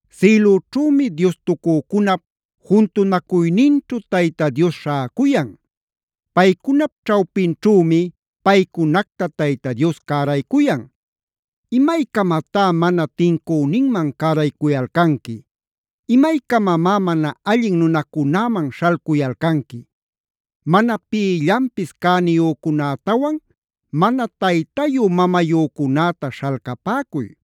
Sïlüćhümi diostucücunap juntunacuyninćhu Tayta Dios śhäcuyan. Paycunap ćhawpinćhümi paycunacta Tayta Dios cäraycuyan: “¿Imaycamatá mana tincüninman cäraycuyalcanqui? ¿Imaycamamá mana allin nunacunäman śhalcuyalcanqui? Mana pïllanpis cäniyücunätawan mana taytayu-mamayücunäta śhalcapäcuy.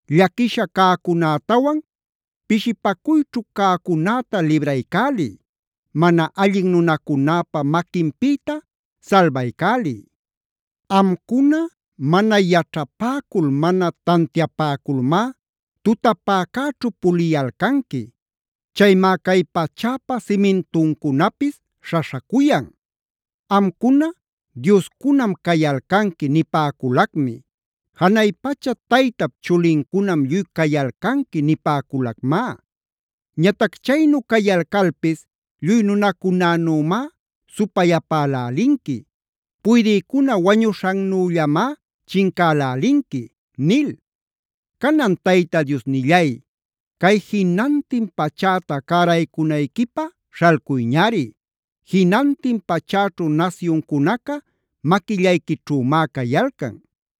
Llaquisha cäcunätawan pishipacuyćhu cäcunäta libraycäliy. Mana allin nunacunäpa maquinpïta salbaycäliy. “Amcuna mana yaćhapäcul, mana tantiapäculmá tutapäcäćhu puliyalcanqui. Chaymá cay pachäpa simintuncunapis śhaśhacuyan. “ ‘Amcuna dioscunam cayalcanqui nipäculacmi’.b ‘Janay pacha Taytap chulincunam lluy cayalcanqui’ nipäculacmá. Ñatac chaynu cayalcalpis lluy nunacunänümá supayapälälinqui. Puydïcuna wañuśhannüllamá chincälälinqui” nil. Canan, Tayta Diosnillay, cay jinantin pachäta cäraycunayquipä śhalcuyñari. Jinantin pachäćhu nasyuncunaca maquillayquićhümá cayalcan.